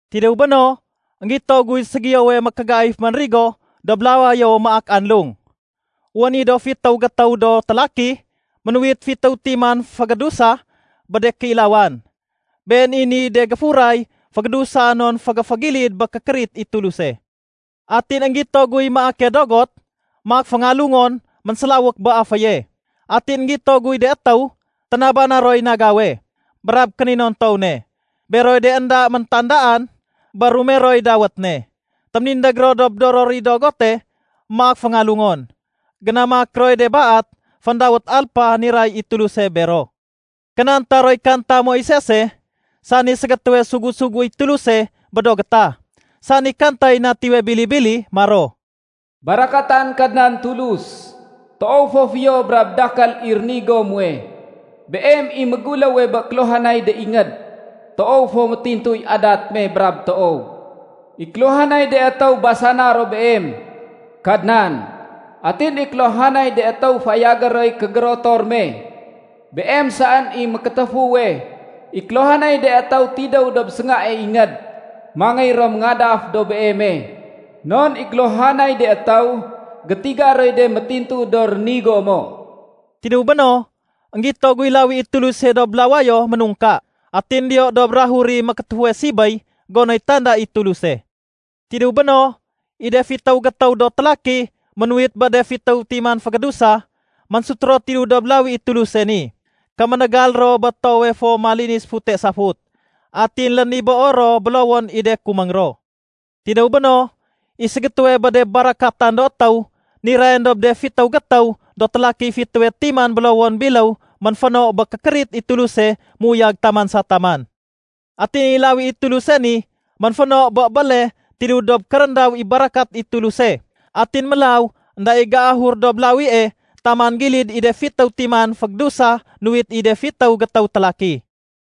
Tidéw béno, énggito guy ségiyowe mékégaif ménrigo dob lawayo maak anlung. Wén i do fitéw gétéw do télaki ménuwit fitéw timan fégédusa bé de kéilawan. Been i niy de géfuray fégédusa non fégéfégilid bé kékérit i Tuluse. Atin énggito guy maake dogot maak féngalungon ménsélawék bé aféye. Atin énggito guy de étéw ténabana roy nagawe brab kéninontow ne. Beroy de énda méntandaan bé rumeroy dawét ne. Téménindég ro dob doror i dogote maak féngalungon. Génamak roy de baat féndawét alpa niray i Tuluse bero. Kénanta roy kanta Moisese, sani ségétéwe sugu-suguéy Tuluse bé do gétah, sani kantay Natiwe Bili-bili maro, “Barakatan Kadnan Tulus, toow fo fiyo brab dakél i rénigo muwe! Beem i méguléwe bé kéluhanay de ingéd. Toow fo métintuy adat me brab toow. I kéluhanay de étéw basana ro Beem, Kadnan. Atin i kéluhanay de étéw fayagé roy kégérotor me. Beem saén i mékétéfuwe. I kéluhanay de étéw tidéw dob séngae ingéd, mangéy ro méngadaf dob Beeme. Non i kéluhanay de étéw gétiga roy de métintu do rénigo mo.” Tidéw béno, énggito guy lawi i Tuluse dob lawayo ménungka. Atin diyo dob bukagey mékétéfuwe sibéy gonoy tanda i Tuluse. Tidéw béno, i de fitéw gétéw do télaki ménuwit bé de fitéw timan fégédusa, ménsut ro tidéw dob lawi i Tuluse ni. Kéménégal ro bé toowe fo malinis fute safut. Atin lénibéo ro bélowon i de kuméng ro. Tidéw béno, i ségétéwe bé de barakatan do étéw nirayén dob de fitéw gétéw do télakiy fitéwe timan bélowon biléw ménféno bé kékérit i Tuluse méuyag taman sa taman. Atin i lawi i Tuluse ni ménféno bé béle tidéw dob kéréndaw i barakat i Tuluse, atin mélaw énda i géahur dob lawie taman gilid i de fitéw timan fégédusa nuwit i de fitéw gétéw télaki.